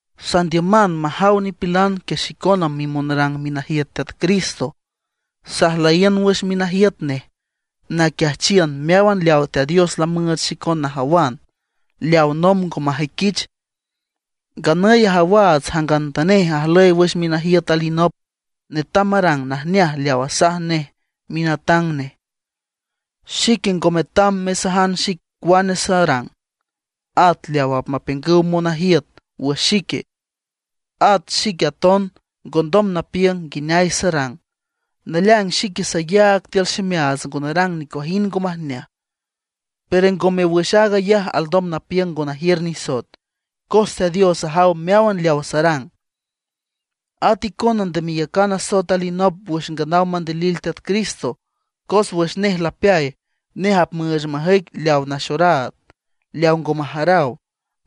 Sandiüman majaw nipilan que xicona mimonrang minajiüt Teat Cristo; sajlüyiün wüx minajiüt nej naquiajchiün meáwan leaw Teat Dios lamüüch xicon najawan, leawa nomb ngo majüiquich. Nganüy ajawaats jangantanej ajlüy wüx minajiüt alinop, netam marang najneaj leaw asaj nej minatang nej. Xique ngo metam mesajan xic cuane sarang, at leaw apmapiüngüw monajiüt wüx xique. At xique aton ngondom napiüng nguineay sarang. Naleaing xique sayaag tiül ximeaats ngo narang nicuajind ngo majneaj; pero ngome wüx aag ayaj alndom napiüng ngo najiür nisoet, cos Teat Dios ajaw meáwan leaw sarang. At icona nde meyacan asoet alinop wüx nganaw mandilil Teat Cristo, cos wüx nej lapeay, nej apmüüch majüic leaw naxoraad, leaw ngo majaraw.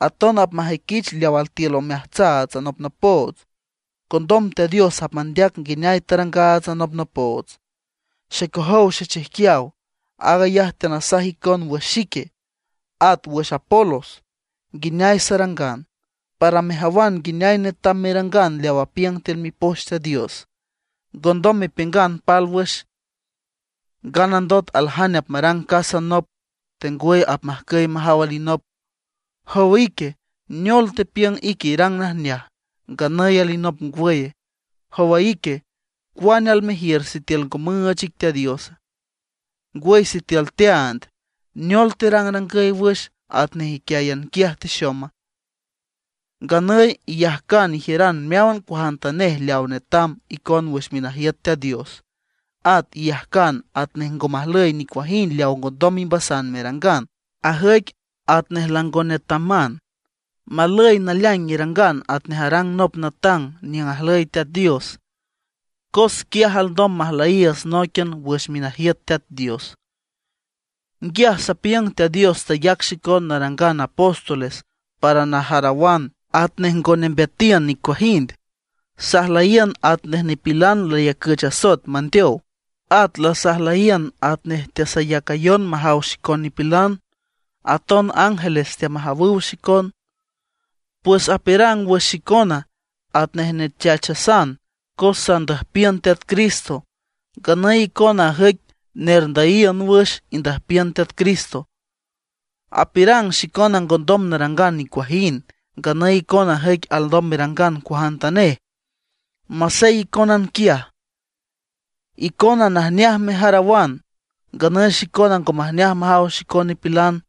Aton apmajüiquich leaw altiül omeajtsaats anopnopoots. Condom Teat Dios apmandeac nguineay tarangaats anopnopoots. Xecojow xechijquiaw, aag ayaj teanasaj icon wüx xique, at wüx Apolos, nguineay sarangan, para mejawan nguineay netam merangan leaw apiüng tiül Mipoch Teat Dios. Ngondom mepiüngan pálwüx, nganandot aljane apmarang casa nop, tengwüy majcüy majaw alinop. Jow ique, ¿neol tepiüng ique irang najneaj, nganüy alinop ngwüye? Jow ique, ¿cuane almejiür sitiül ngo müüch ic Teat Diosa? Ngwüy sitiül teaand, ¿neol terangrangüy wüx atnej íquian quiaj texoma? Nganüy iyajcan ijiüran meáwan cuajantanej leaw netam icon wüx minajiüt Teat Dios; at iyajcan atnej ngo majlüy nicuajind leaw ngondom imbasan merangan; ajüic atnej lango netaman. Malüy naleaing irangan atnej arang nop natang niüng ajlüy Teat Dios, cos quiaj alndom majlüyiiüts nóiquian wüx minajiüt Teat Dios. Nguiaj sapiüng Teat Dios tayac xicon narangan apóstoles para najarawan atnej ngo nembeatiün nicuajind. Sajlüyiün atnej nipilan layacüch asoet mandeow. At lasajlüyiün atnej teasayacan majaw xicon nipilan; aton ángeles teamajawüw xicon. Pues apiürang wüx xicona atnej nechachasan cos sandüjpiün Teat Cristo; nganüy icona ajüic nerndüyiün wüx indüjpiün Teat Cristo. Apiürang xicona ngondom narangan nicuajind; nganüy icona ajüic alndom merangan cuajantanej, masey icónan quiaj. Icona najneaj mejarawan; nganüy xicona ngo majneaj majaw xicon nipilan.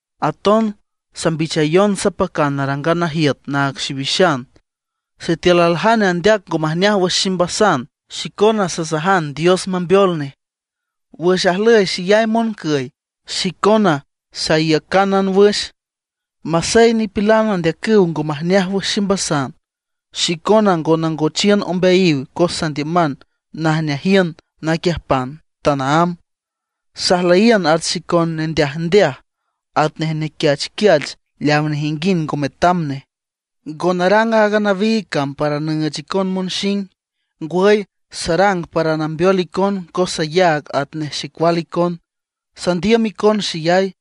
Aton sambichayon sapacan narangan najiüt naag xiwixan. Sitiül aljane andeac ngo majneaj wüx ximbasan, xicona sasajan Dios mambeol nej. Wüx ajlüy xeyay moncüy, xicona saiücánan wüx. Masey nipilan andeacüw ngo majneaj wüx ximbasan, xicona ngo nangochiün ombeayiw cos sandiüman najneajiün naquiüjpan tanaámb. Sajlüyiün at xicon nendeajndeaj, atnej nequiachquiach leaw nejinguind ngo metam nej. Ngo narang aaga nawiig cam para nüüch icon monxing, ngwüy sarang para nambeol icon cos sayaag atnej xecual icon, sandiüm icon xeyay.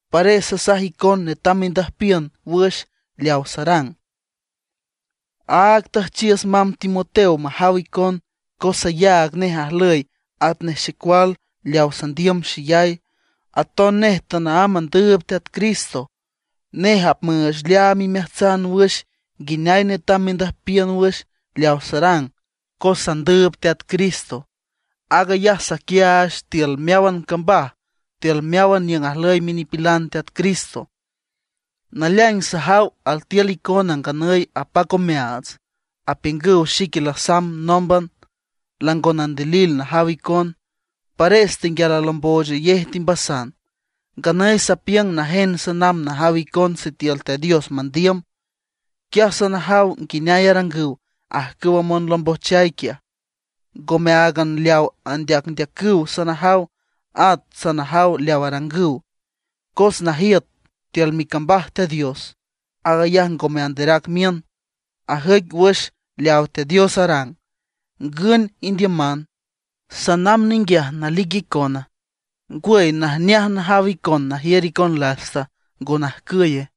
Pares sasaj icon netam mendüjpiün wüx leawa sarang. Áag tüjchiüs mamb Timoteo majaw icon, cos sayaag nej ajlüy atnej xecual leaw sandiüm xeyay; aton nej tanaámb andüüb Teat Cristo. Nej apmüüch leaam imeajtsan wüx nguineay netam mendüjpiün wüx leaw sarang cos sandüüb Teat Cristo. Aag ayaj saquiaach tiül meáwan cambaj tiül meáwan niüng ajlüy minipilan Teat Cristo. Naleaing sajaw altiül icona nganüy apac omeaats, apiüngüw xique lasamb nómban, lango nandilil najaw icon, pares tenguial alombojchayej timbasan. Nganüy sapiüng najen sanamb najaw icon sitiül Teat Dios mandiüm. Quiaj sanajaw nguineay arangüw ajcüwa monlombojchay quiaj, ngome áagan leaw andeacndeacüw sanajaw, at sanajaw leaw arangüw. Cos najiüt tiül micambaj Teat Dios, aag ayaj ngome anderac miün, ajüic wüx leaw Teat Dios arang. ¿Ngün indiüman? ¿Sanamb ninguiaj nalic icona? ¿Ngwüy najneaj najaw icona najiür icon lasta, ngo najcüye?